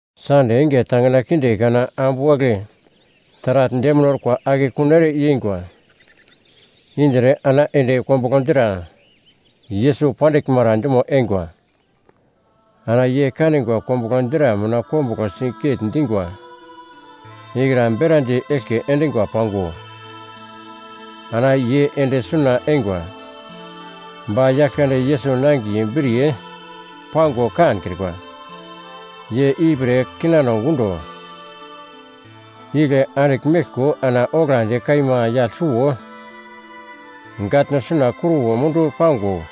Sande enge tangina kinde kana ambu wagle taragl demine orkwa akekun ere yeingwa indre ana ende kombuglo dra Yesus pandiglmara dumo eingwa. Ana ye kanigwa kombuglo dra mina kombuglo siget-dingwa ikra berandi eglke endingwa pango, ana ye ende suna eingwa, ba Yaglkande Yesus nangiye briye pango kankrikwa. Ye ipre kinano gundo igle andigl meglko ana oglandi kaima yagl suwo gatno suna kruwo mundu pango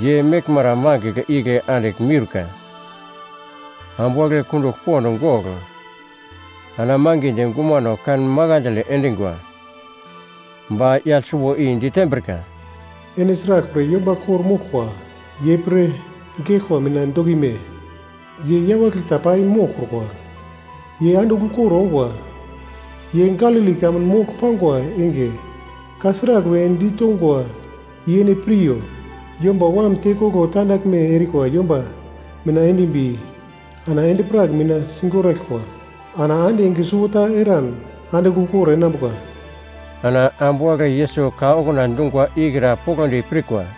ye meglmara mangigl igle andigl miurka. Ambu wagle kundugl pond gogl ana mangidi gumano kan makandle endingwa, ba yagl suwo i ditembrika, “Ene sraglpre yomba kor-moglkwa ye pre geglkwa mina dokime? Ye yawagle ta pai moglkrukwa. Ye andigl ukor ongwa! Ye Galili kamun mogl pangwa enge, ka sragl we ditongwa, i ene piryo, ‘Yomba Wam tekoglo tandaglme erikwa yomba mina endimbi ana endi-prak mina sigoraglkwa, ana ande enge suwota eran andigl ukor enambuka.’” Ana ambu wagle Yesus ka okuna dungwa ikra poglodi pirkwa.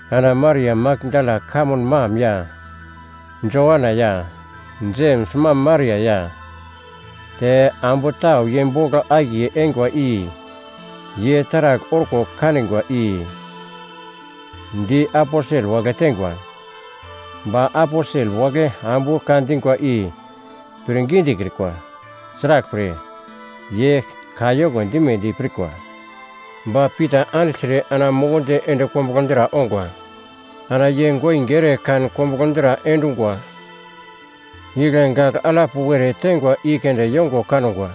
Ana Maria Makdala kamun mam ya, Joana ya, Jems mam Maria ya, te ambu tau ye bogl akiye eingwa i ye taragl orko kanigwa i di aposel wagle teingwa. Ba aposel wagle ambu ka dingwa i pir gidikrikwa. Sraglpre, ye kayoko dimedi pirkwa. Ba Pita andigltre ana mukundi ende kombuglo dra ongwa. Ana ye goinge ere kan kombuglo dra endungwa igle gagl alap were teingwa i keunde yongo kangwa.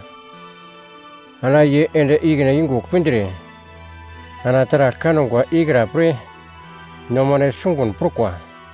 Ana ye ende ikine yungugl pindre, ana taragl kangwa ikra pre nomane sungun prukwa.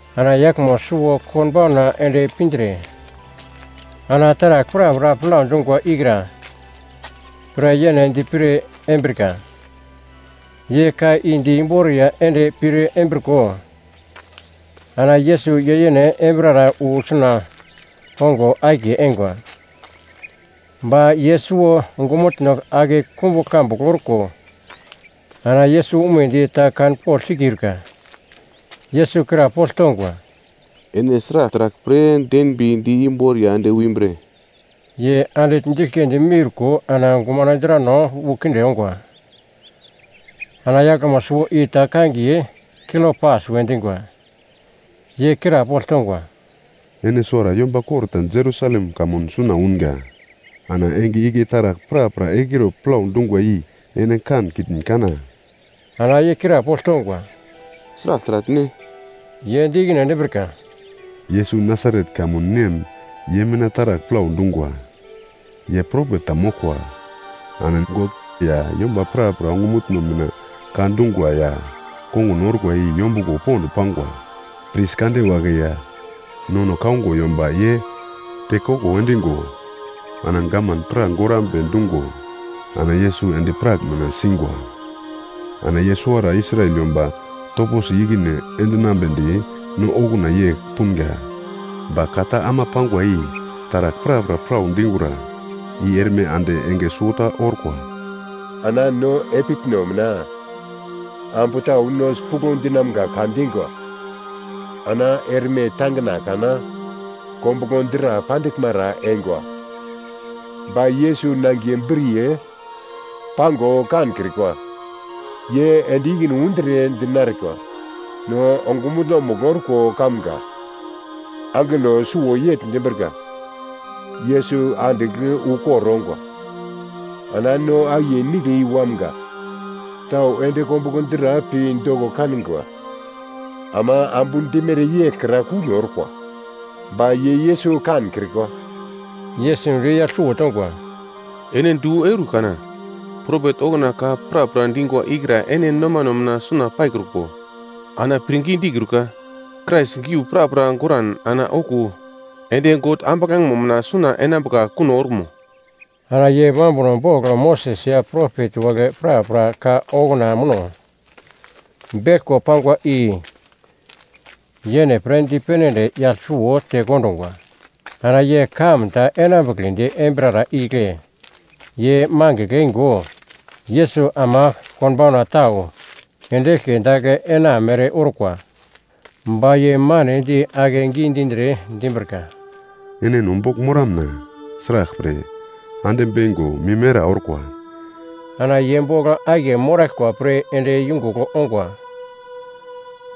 Ana yaglmo suwo konbauna ende pindre, ana taragl prapra plau dungwa ikra pre yene dipir embrika. Ye ka i di imboriya ende pir embriko, ana Yesus ye yene embirara wu suna ongo akiye eingwa. Ba ye suwo ongumutno ake kumbugl kambugl orko ana Yesus umedi ta kanpogl sikiurka. Yesus krapogl tongwa, “Ene sragl taragl pre denbi di imbor ya ende umbre?” Ye andigl diglkindi miurko ana gumano drano wu kinde ongwa. Ana yaglmo suwo i ta kangiye Kliopas we dingwa, ye krapogl tongwa, “Ene suwara yomba kor ta Jerusalem kamun suna ungwa. Ana enge igle taragl prapra egliro plau dungwa i ene kankitn kana?” Ana ye krapogl tongwa, “Sragl taragl ne?” Ye di ikine endimbrika, “Yesus Nasaret kamun nem ye mina taragl plau dungwa. Ye propet ta moglkwa. Ana God ya yomba prapra ongumutno mina ka dungwa ya kongun orkwa i yombuglo pond pangwa. Pris kande wagle ya nono kaungo yomba ye tekoglo endingo ana gavman pra gorambe dungo, ana Yesus endi-prak mina singwa. Ana ye suwara Israel yomba toposi ikine endinambedi no okuna yegl punga, ba ka ta ama pangwa i taragl prapra plau dingura i erme ande enge suwota orkwa. Ana no epitno mina ambu tau no sipuglo dinamga ka dingwa. Ana erme tangina kana kombuglo dra pandiglmara eingwa. Ba Yesus nangiye briye pango kankrikwa, ye ende ikine undre dinerikwa, no ongumutno-mugl orko kamga angelo suwo yegl dimbrika, ‘Yesus andigl ukor ongwa.’ Ana no akiye nigle i wamga tau ende kombuglo dra pi doko kanigwa, ama ambu dimere yeglkra kuno orkwa, ba ye Yesus kankrikwa.” Yesus di yagl suwo tongwa, “Ene du eur kana, propet okuna ka prapra dingwa i kra ene nomano mina suna paikruko, ana pirngidi kiurika! Krais geu prapra goglkran ana okuwo ende God ambuglangemo mina suna enambuka kuno orumo?” Ana ye mambuno bogl Moses ya propet wagle prapra ka okuna muno beglko pangwa i yene pre dipene ende yagl suwo tekondungwa. Ana ye kamun ta enambugledi embirara igle ye mangigl eingo, Yesus ama konbauna tau ende eglke dagl ena mere orkwa. Ba ye manedi akegi dindre, dimbrika, “Ene no bogl moramna, sraglpre, ande beingo mim era orkwa.” Ana ye bogl akiye moraglkwa pre ende yungugl ongwa.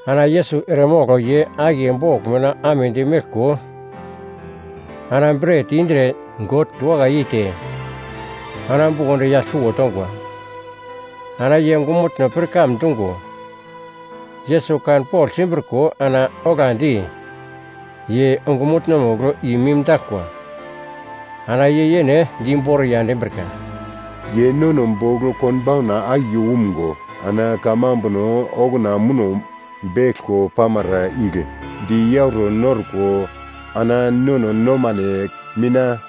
Ana Yesus eremogl ye akiye bogl mina amedi meglko, ana bret indre God diwakai yeite, ana bukondi yagl suwo tongwa. Ana ye ongumutno pirkam dungo, Yesus kanpogl simbriko ana oglandi ye ongumutno-mugl i-mimdaglkwa. Ana ye yene di imboriya endimbrika, “Ye nono bogl konbauna akiye umgo, ana kamambuno okuna muno beglko pamara igle di yauro norko, ana nono nomano mina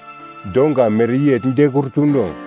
donga mereyegl dekrutuno?”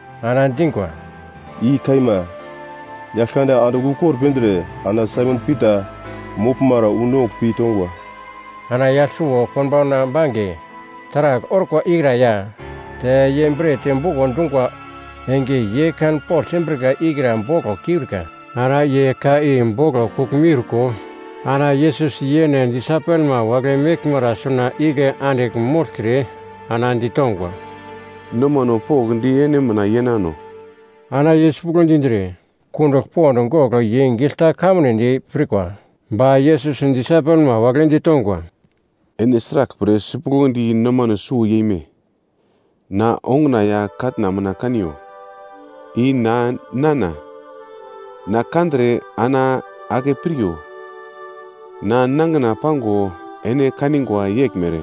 ana dingwa, “I kaima! Yaglkande andigl ukor pindre, ana Saimon Pita moglmara wu nongugl pi tongwa.” Ana yagl suwo konbauna bange taragl orkwa ikra ya, te ye bret buko dungwa enge i ye kanpogl simbrika ikra boglo kiurika. Ana ye ka i boglo kugl miurko, ana Yesus yene disaipelma wagle meglmara suna igle andigl mogltre, ana ditongwa, “Nomano pokndi ene mina yenano.” Ana ye sipuglo dindre, kundugl pond gogl ye gigl ta kanmunedi pirkwa. Ba Yesus disaipelma wagle ditongwa, “Ene sraglpre sipuglodi nomano suwo yeme? Na onguna ya katna mina kaniyo. I na, nana! Na kandre ana ake piryo, na nangina pango ene kanigwa yeglmere,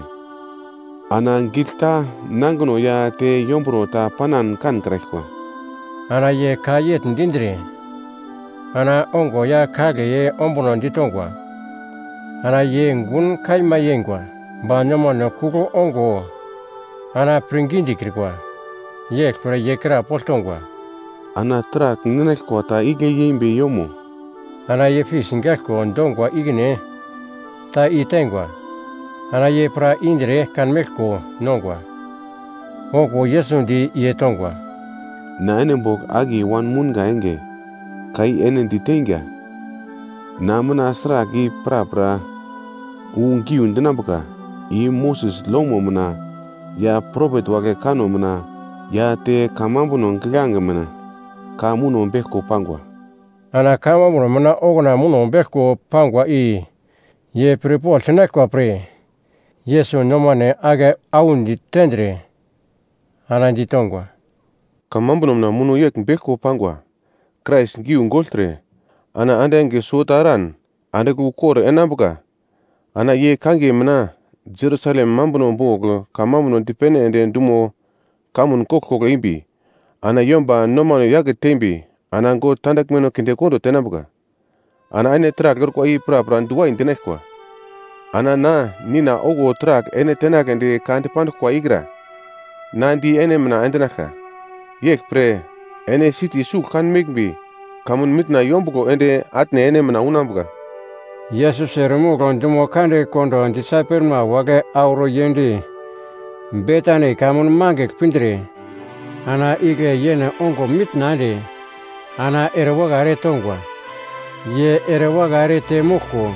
ana gigl ta nangino ya te yomburo ta panan kankraglkwa.” Ana ye ka yegl dindre, ana ongo ya kagle ye ombuno ditongwa. Ana ye gun kaima yeingwa ba nomano kugl ongo ana pirngidi dikrikwa. Yeglpre ye krapogl tongwa, “Ana taragl ninaglkwa ta igle yeimbi yomo?” Ana ye fis gaiglko dongwa ikine ta i teingwa. Ana ye pra indre kanmeglko nongwa. Okuwo Yesus di ye tongwa, “Na ene bogl akiye wanmounga enge, ka i ene diteinga, na mina sragl i prapra wu giu dinambuka i Moses lomo mina ya propet wagle kanno mina ya te kamambuno giglange mina ka muno beglko pangwa.” Ana kamambuno mina okuna muno beglko pangwa i ye pirpogl sinaglkwa pre, Yesus nomano ake audi tendre ana ditongwa, “Kamambuno mina muno yegl beglko pangwa Krais giu gogltre, ana ande enge suwota eran andigl ukor enambuka. Ana ye kangiye mina Jerusalem mambuno bogl kamambuno dipene ende dumo kamun koglkoglo embi ana yomba nomano yake tembi ana God tandaglmeno kindekondo tenambuka. Ana ene taragl orkwa i prapra diwai dinaglkwa. Ana na Nina okuna taragl ene tenagledi ka dipanduglkwa ikra na di ene mina endinaglka. Yeglpre ene siti sugl kan meglmbi kamun mitna yombuglo ende atne ene mina unambuka.” Yesus eremogl dumo kande kondo disaipelma wagle auro yend Betani kamun mangigl pindre, ana igle yene ongo mitna ende ana ere wakai ere tongwa. Ye ere wakai ere temoglko,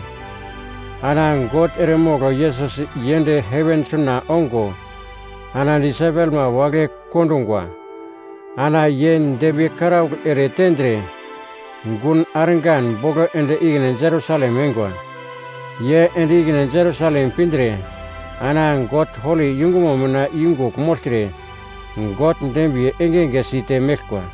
ana God eremogl Yesus yend heven suna ongo ana disaipelma wagle kondungwa. Ana ye dembiye karaugl ere tendre, gun argan bogl ende ikine Jerusalem eingwa. Ye ende ikine Jerusalem pindre, ana God holi yungumo mina yungugl mogltre, God dembiye engenge site meglkwa.